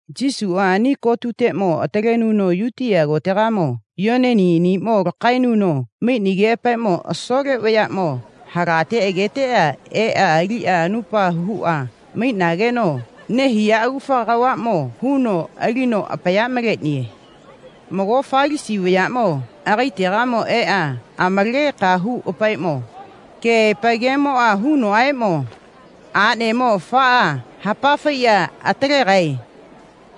Yesuʼa ani kotetiʼmo atalenuno Yutiya kotegamo Yoneni aniʼmo lakaenuno maiʼnigeʼapaeʼmo asole vayaʼmo halate agaetega eʼa aliʼa anupa huʼa maiʼnageno nehiya agufa kavaʼmo huno alino apaya maleʼniye. Mago Falasi vayaʼmo agaetegamo eʼa amalageka huʼapaeʼmo, keʼaepa gemoʼa hunoʼaeʼmo, aʼnemo afaʼa hapa faiʼa atalegae,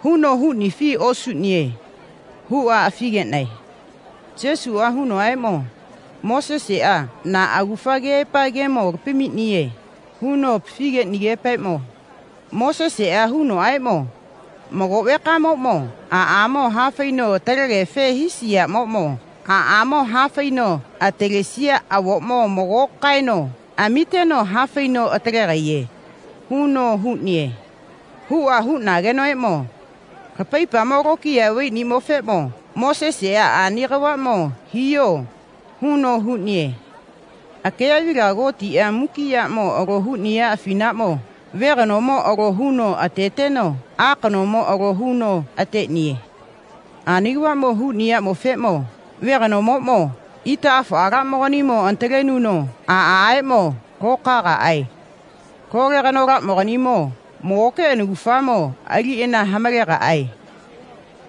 huno huʼnifi osuʼniye, huʼa afi geʼnae. Yesuʼa hunoʼaeʼmo, Moseseʼa na agufa keʼaepa gemo lapamiʼniye, huno apafi geʼnigeʼapaeʼmo, Moseseʼa hunoʼaeʼmo, mago vekamoʼmo aʼamo hafaino atalegefe hisiyaʼmoʼmo aʼamo hafaino atalesiya avoʼmo mago kaeno amiteno ha faino atalegaiye, huno huʼniye, huʼa huʼnagenoʼaeʼmo, lapaipamo lokiya vaiʼniyaʼmofeʼmo Moseseʼa ani kavaʼmo hiyo, huno huʼniye. Akeyaʼvilaga Gotiʼa muki yaʼmo alo huʼniya afinaʼmo ve kanomo alo huno ateteno a kanomo alo huno ateʼniye. Ani kavaʼmo huʼniyaʼmofeʼmo ve kanomoʼmo itaʼafoʼalaʼmoganimo anatalenuno aʼaʼeʼmo lokaegaʼae. Lole kanolaʼmoganimo magoke anakufamo aliʼana hamalegaʼae.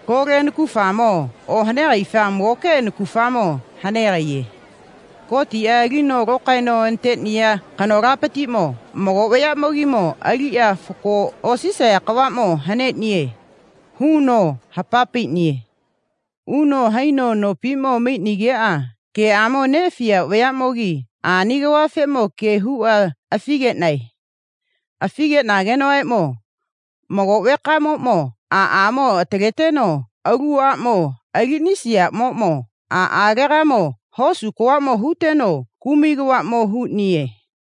Lole anakufamo ohanegaifa magoke anakufamo hanegaiye. Gotiʼa alino lokaeno anateʼniya kanolapatiʼmo mago vayaʼmogimo aliʼa fako osisaya kavaʼmo haneʼniye, huno hapa paiʼniye. Uno haino nopiʼmo maiʼnigeʼa geʼamo neʼafiya vayaʼmogi ani kavafeʼmo ge huʼa afi geʼnae. Afi geʼnagenoʼaeʼmo, mago vekamoʼmo aʼamo ataleteno alu aʼmo aliʼnisiyaʼmoʼmo aʼalegamo hosu kavaʼmo huteno kumai kavaʼmo huʼniye.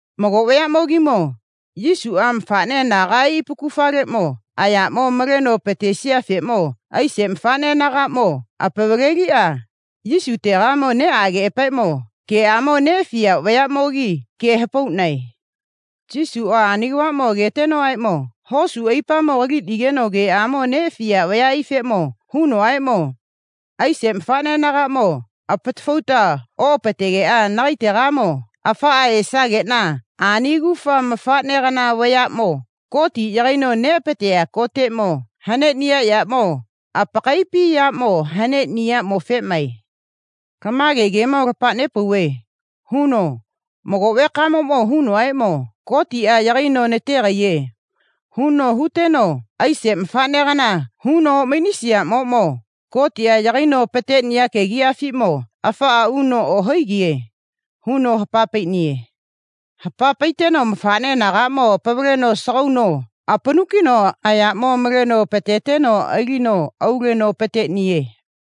Mago vayaʼmogimo Yesuʼa mafaʼne anagaʼai apakufaleʼmo ayaʼmo maleno apatesiyafeʼmo aise mafaʼne anagaʼmo apavaleliʼa Yesutega neʼageʼapaeʼmo geʼamo neʼafiya vayaʼmogi ge hapauʼnae. Yesuʼa ani kavaʼmo agetenoʼaeʼmo hosu aipamo kaliʼnigeno geʼamo neʼafiya vayaʼaifeʼmo hunoʼaeʼmo, aise mafaʼne anagaʼmo apatafauta oʼapategeʼa nagaetegamo afaʼa esageʼna ani agufa mafaʼnegana vayaʼmo Gotiʼa yagaino neʼapateya koteʼmo haneʼniya yaʼmo apakaiʼapi yaʼmo haneʼniyaʼmofeʼmae. Lama gemo lapa nepauve, huno, mago vekamoʼmo hunoʼaeʼmo Gotiʼa yagaino nategaiye, huno huteno aise mafaʼnegana huno oʼmaiʼnisiyaʼmoʼmo Gotiʼa yagaino apateʼniya kegiʼyafiʼmo afaʼa uno ohaigiye, huno hapa paiʼniye. Hapa paiteno mafaʼne anagaʼmo apavaleno asagauno apanu kiʼneno ayaʼmo maleno apateteno alino auleno apateʼniye.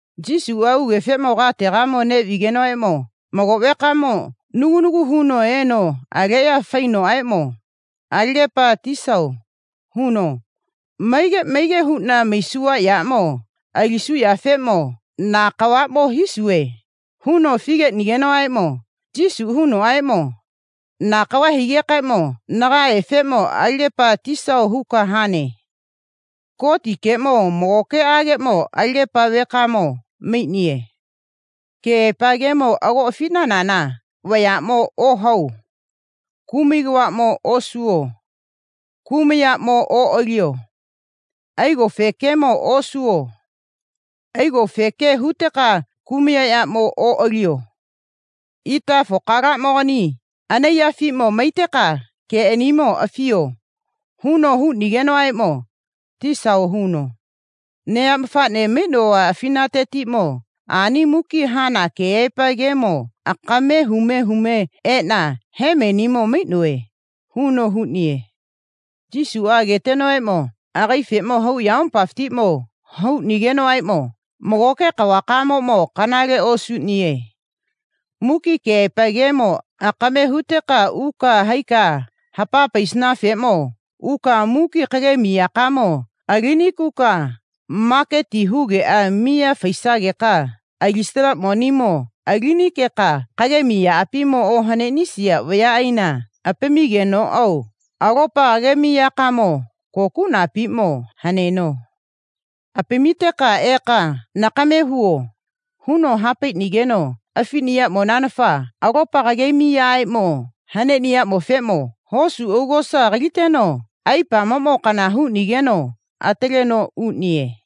Yesuʼa ugefeʼmo kateʼmo neʼvigenoʼaeʼmo mago vekamo nagu nagu huno eno aleʼya faiʼnenoʼaeʼmo, Alagepa tisao, huno, maige maige huʼna maisuva yaʼmo alisuvafeʼmo na kavaʼmo hisuve, huno afi geʼnigenoʼaeʼmo Yesuʼa hunoʼaeʼmo, na kava higekaeʼmo nagaefeʼmo alagepa tisao huka hane. Gotikeʼmo magokeʼageʼmo alagepa vekamo maiʼniye. Keʼaepa gemo ago afiʼnanana vayaʼmo ohapao. Kumai kavaʼmo oso. Kumayaʼmo oʼaliyo. Aigofe gemo osuvo. Aigofe ge huteka kumayaʼmo oʼaliyo. Itaka afokamogani anaiyafiʼmo maiteka geʼanimo afiyo, huno huʼnigenoʼaeʼmo, Tisao, huno, neya mafaʼnemo maiʼnova afinatetiʼmo ani muki hana keʼaepa gemo akame hume hume eʼna hemenimo maiʼnove, huno huʼniye. Yesuʼa agetenoʼaeʼmo agaefeʼmo hau ayamopafiʼmo hauʼnigenoʼaeʼmo, magoke kavakamoʼmo kanale osuʼniye. Muki keʼaepa gemo akame huteka uka haika hapaisanafeʼmo uka muki kagemiyakamo alinikuka maketi hugeʼa miya faitesageka alisana monimo alinikeka kagemi yaʼapimo ohaneʼnisiya vayaʼaina apamigenoʼao alopa kagemiyakamo kokuʼnapiʼmo haneno. Apamiteka eka nakame huvo, huno ha paiʼnigeno afiʼniyaʼmonanafa alopa kagemiyaʼamo haneʼniyaʼmofeʼmo hosu augosa kaliteno aipamoʼmo kana huʼnigeno ataleno uʼniye.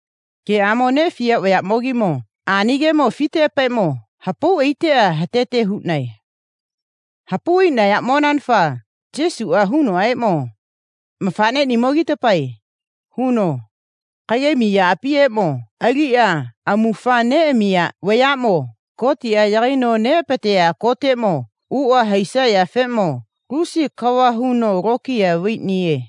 Geʼamo neʼafiya vayaʼmogimo ani gemo afiteʼapaeʼmo hapau aiteʼa atete huʼnae. Hapau aiʼnayaʼmonanafa Yesuʼa hunoʼaeʼmo, mafaʼneʼnimogitapae, huno, kagemi yaʼapieʼmo aliʼa amufa neʼamiya vayaʼmo Gotiʼa yagaino neʼapateya koteʼmo uʼa haisayafeʼmo lusi kava huno lokiya vaiʼniye.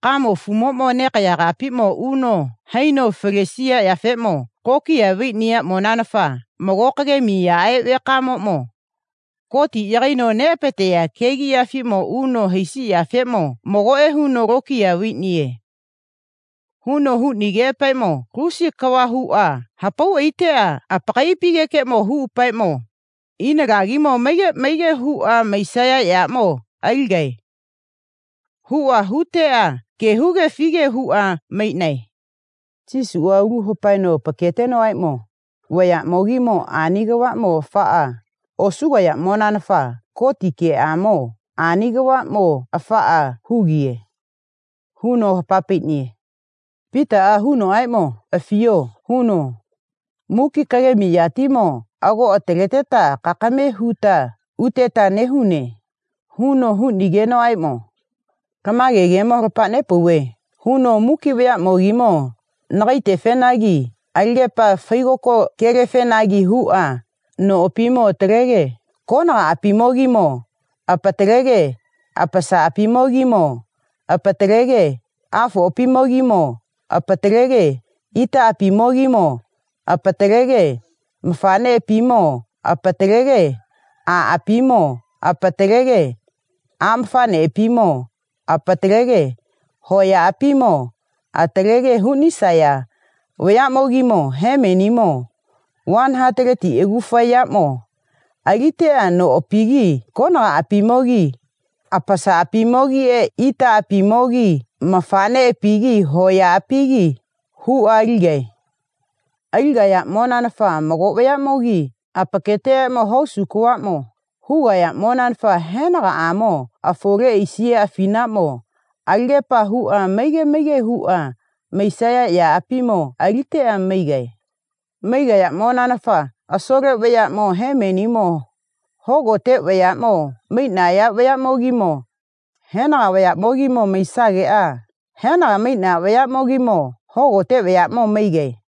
Kamo afumoʼmo nekaya kapiʼmo uno haino falesiyafeʼmo lokiya vaiʼniyaʼmonanafa mago kagemiyaʼe vekamoʼmo Gotiʼa yagaino neʼapateya kegiʼyafiʼmo uno haisiyafeʼmo magoʼe huno lokiya vaiʼniye, huno huʼnigeʼapaeʼmo lusi kava huʼa hapau aiteʼa apakaiʼapimo huʼapaeʼmo, ina lagimo maige maige huʼa maisaya yaʼmo aligae, huʼa huteʼa ge huge afige huʼa maiʼnae. Yesuʼa aulu hapaeno apaketenoʼaeʼmo, vayaʼmogimo ani kavaʼmo afaʼa osugayaʼmonanafa Gotikeʼmo ani kavaʼmo afaʼa hugiye, huno hapa paiʼniye. Pitaʼa hunoʼaeʼmo, Afiyo, huno, muki kagemi yatimo ago ataleteta kakame huta uteta nehune, huno huʼnigenoʼaeʼmo lama gemo lapa nepauve, huno muki vayaʼmogimo nagaetefenagi alagepa faigoko gelefenagi huʼa noʼapimo atalege konagaʼapimogimo apatalege apasaʼapimogimo apatalege afoʼapimogimo apatalege itaʼapimogimo apatalege mafaʼneʼapimo apatalege aʼapimo apatalege aʼmafaʼneʼapimo apatalege hoyaʼapimo atalege huʼnisaya vayaʼmogimo hemenimo vani hataleti agufa yaʼmo aliteʼa noʼapigi konagaʼapigi apasaʼapimogiʼe itaʼapimogiʼenagi mafaʼneʼapigi hoyaʼapiʼenagi huʼa aligae. Aligayaʼmonanafa mago vayaʼmogi apakaetegamo hosu kavaʼmo hugayaʼmonanafa henagaʼamo afole aisiya afinaʼmo alagepa huʼa maige maige huʼa maisaya yaʼapimo aliteʼa maigae. Maigayaʼmonanafa asole vayaʼmo hemenimo hogote vayaʼmo maiʼnaya vayaʼmogimo henaga vayaʼmo maisageʼa henaga maiʼnaya vayaʼmogimo hogote vayaʼmo maigae.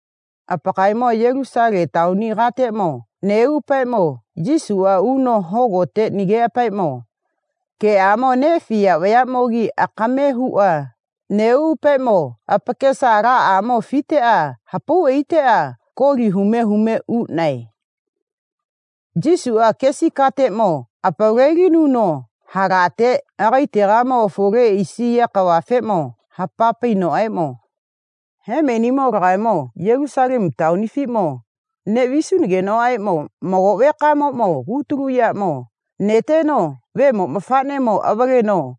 Apakaemo Yulusale taoni kateʼmo neʼuʼapaeʼmo Yesuʼa uno hogotetegeʼa geʼamo neʼafiya vayaʼmo akame huʼa neʼuʼapaeʼmo apakesa alaʼamo afiteʼa hapau aiteʼa koli hume hume uʼnae. Yesuʼa kesi kateʼmo apavalelinuno halate agaetegamo afole aisiya kavafeʼmo hapa painoʼaeʼmo, Hemenimo lagaemo Yulusalemu taonifiʼmo neʼvisunagenoʼaeʼmo mago vekamoʼmo kutulu yaʼmo neteno Vemo mafaʼnemo avaleno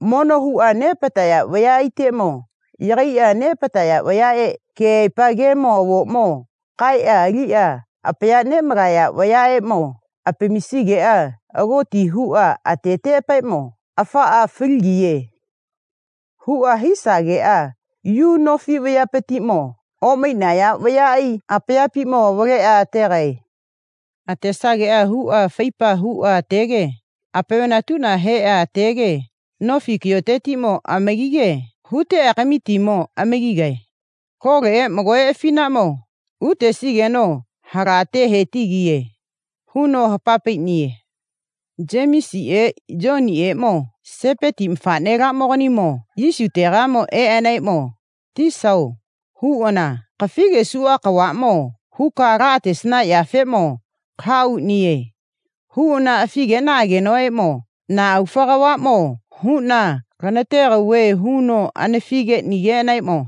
mono huʼa neʼapataya vayaʼaiteʼmo yagaiʼa neʼapataya vayaʼe keʼaepa gemo avoʼmo kaeʼa aliʼa apaya neʼmalaya vayaʼeʼmo apamisigeʼa agoti huʼa ateteʼapaeʼmo, afaʼa faligiye, huʼa hisageʼa Yu nofi vayapatiʼmo oʼmaiʼnaya vayaʼai apayapiʼmo avaleʼa ategae. Atesageʼa huʼa faipa huʼa atege apaviʼna heʼa atege nofi kayotetiʼmo amagige huteʼa kamitimo amagigae. Loleʼe magoʼe afinaʼmo utesigeno halate he tigiye, huno hapa paiʼniye. Yemisiʼe Yoniʼeʼmo Sepeti mafaʼnelaʼmoganimo Yesutega eʼanaeʼmo, Tisao, huʼana, kafi gesuʼa kavaʼmo huka laʼatesanafekeʼmo laʼahauʼniye, huʼana afi geʼnaʼagenoʼaeʼmo, na agufa kavaʼmo huʼna lanategauve, huno anafi geʼnigeʼanaeʼmo,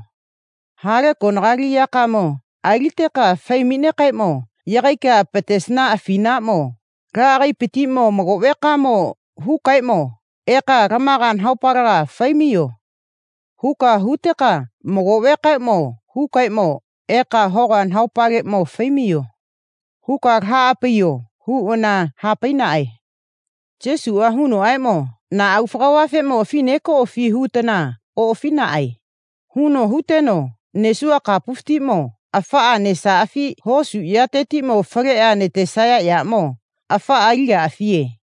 ha le konali yakamo aliteka fai maiʼnekaeʼmo yagaika apatesana afinaʼmo laʼagaepatiʼmo mago vekaeʼmo hukaeʼmo, eka lamaga nahaopaleʼmo fai maiyo, huka huteka mago vekaeʼmo hukaeʼmo, eka hoga nahaopaleʼmo fai maiyo, huka laʼaha paiyo, huʼana ha paiʼnaʼae. Yesuʼa hunoʼaeʼmo, na agufa kavafeʼmo afi nekoʼafi hutana oʼafiʼnaʼae, huno huteno, nesuva kapufatiʼmo afaʼa nesaʼafi hosu yatetiʼmo faleʼa natesaya yaʼmo afaʼa aligaʼafiye,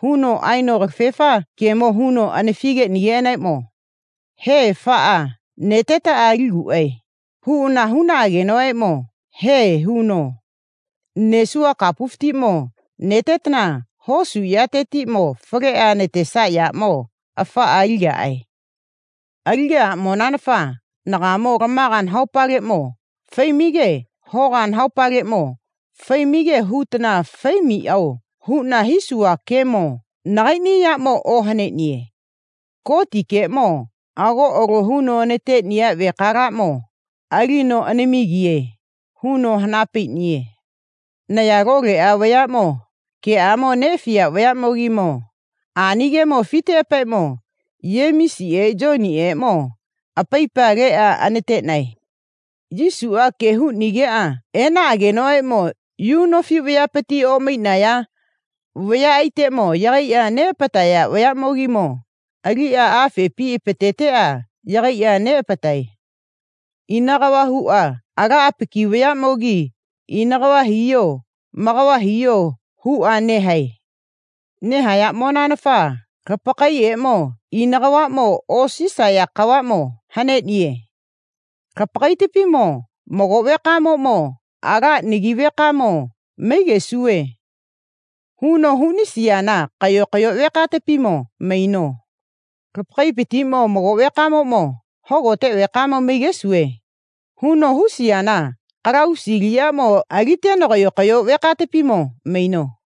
huno aeno kalafefa gemo huno anafi geʼnigeʼanaeʼmo, he, afaʼa netetaʼa aliguʼae, huʼana huʼnaʼagenoʼaeʼmo he, huno, nesuva kapufatiʼmo netetana hosu yatetiʼmo faleʼa natesaya yaʼmo afaʼa aligaʼae. Aligaʼaʼmonanafa nagaemo lamaga nahaopaleʼmo fai maige hoga nahaopaleʼmo fai maige hutana fai maiʼao huʼna hisuva gemo nagaiʼni yaʼmo ohaneʼniye. Gotikeʼmo ago alo huno anateʼniya vekalakeʼmo alino anamigiye, huno hana paiʼniye. Naya loleʼa vayaʼmo geʼamo neʼafiya vayaʼmogi ani gemo afiteʼapaeʼmo Yemisiʼe Yoniʼeʼmo apaipa leʼa anateʼnae. Yesuʼa ge huʼnigeʼa eʼnagenoʼaeʼmo, Yu nofi vayapati oʼmaiʼnaya vayaʼaiteʼmo yagaiʼa neʼapataya vayaʼmogi aliʼa afepi apateteʼa yagaiʼa neʼapatae. Ina kava huʼa ala apaki vayaʼmogi ina kava hiyo ma kava hiyo, huʼa nehae. Nehayaʼmonanafa lapakaemo ina kavaʼmo osisaya kavaʼmo haneʼniye. Lapakaepatiʼmo mago vekamoʼmo, ala nagi vekamo maigesuve, huno huʼnisiyana kayo kayo vekatapimo maino. Lapakaepatiʼmo mago vekamoʼmo, hogote vekamo maigesuve, huno huʼnisiyana kalavusi aliʼyaʼmo aliteno kayo kayo vekatapimo maino.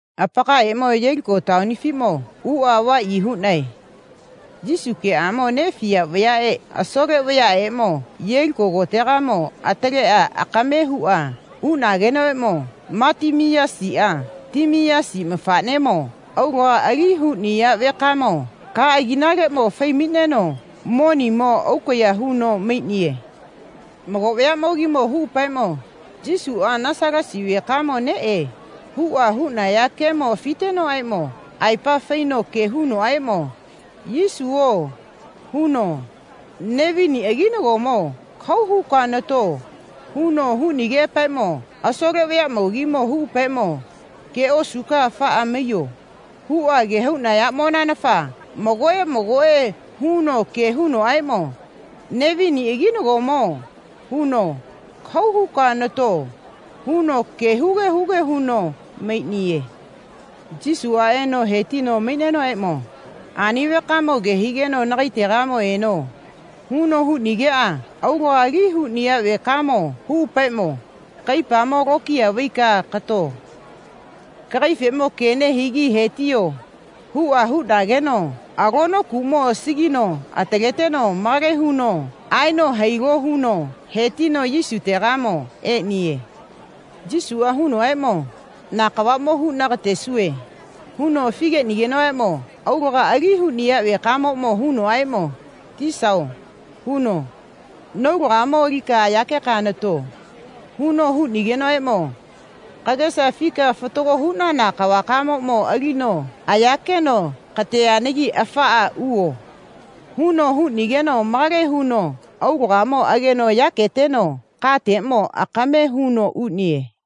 Apakaemo Yeliko taonifiʼmo uʼa avaʼyi huʼnae. Yesu geʼamo neʼafiya vayaʼe asole vayaʼeʼmo Yeliko kotega ataleʼa akame huʼa uʼnageno Matimiyasiʼa Timiyasi mafaʼnemo aulaga ali huʼniya vekamo ka agiʼnaleʼmo fai maiʼneno monieʼmo aukaya huno maiʼniye. Mago vayaʼmogi huʼapaeʼmo, Yesuʼa Nasalasa vekamo neʼe, huʼa huʼnaya gemo afitenoʼaeʼmo aepa faino ge hunoʼaeʼmo, Yesuo, huno, Nevini aginagomo kahau huka nato, huno huʼnigeʼapaeʼmo asole vayaʼmogi huʼapaeʼmo, ge osuka afaʼa maiyo, huʼa ge hauʼnayaʼmonanafa magoʼe magoʼe huno ge hunoʼaeʼmo, Nevini aginagomo, huno, kahau huka nato, huno ge huge huge huno maiʼniye. Yesuʼa eno he tino maiʼnenoʼaeʼmo, ani vekaeʼmo ke higeno nagaetegamo eno, huno huʼnigeʼa aulaga ali huʼniya vekaeʼmo huʼapaeʼmo, kaipamo lokiya vaika kato. Kagaefeʼmo ge nehigi he tiyo, huʼa huʼnageno alonokuʼmo asagino ataleteno malage huno aeno hailo huno he tino Yesutegamo eʼniye. Yesuʼa hunoʼaeʼmo, na kavaʼmo huʼna katesuve, huno afi geʼnigeno aulaga ali huʼniya vekamoʼmo hunoʼaeʼmo, Tisao, huno, naulagamo alika ayakeka nato, huno huʼnigenoʼaeʼmo, kagesa afika fatago huʼnana kavakamoʼmo alino ayakeno kateʼnigi afaʼa uvo, huno huʼnigeno malage huno aulagamo ageno yaketeno kateʼmo akame huno uʼniye.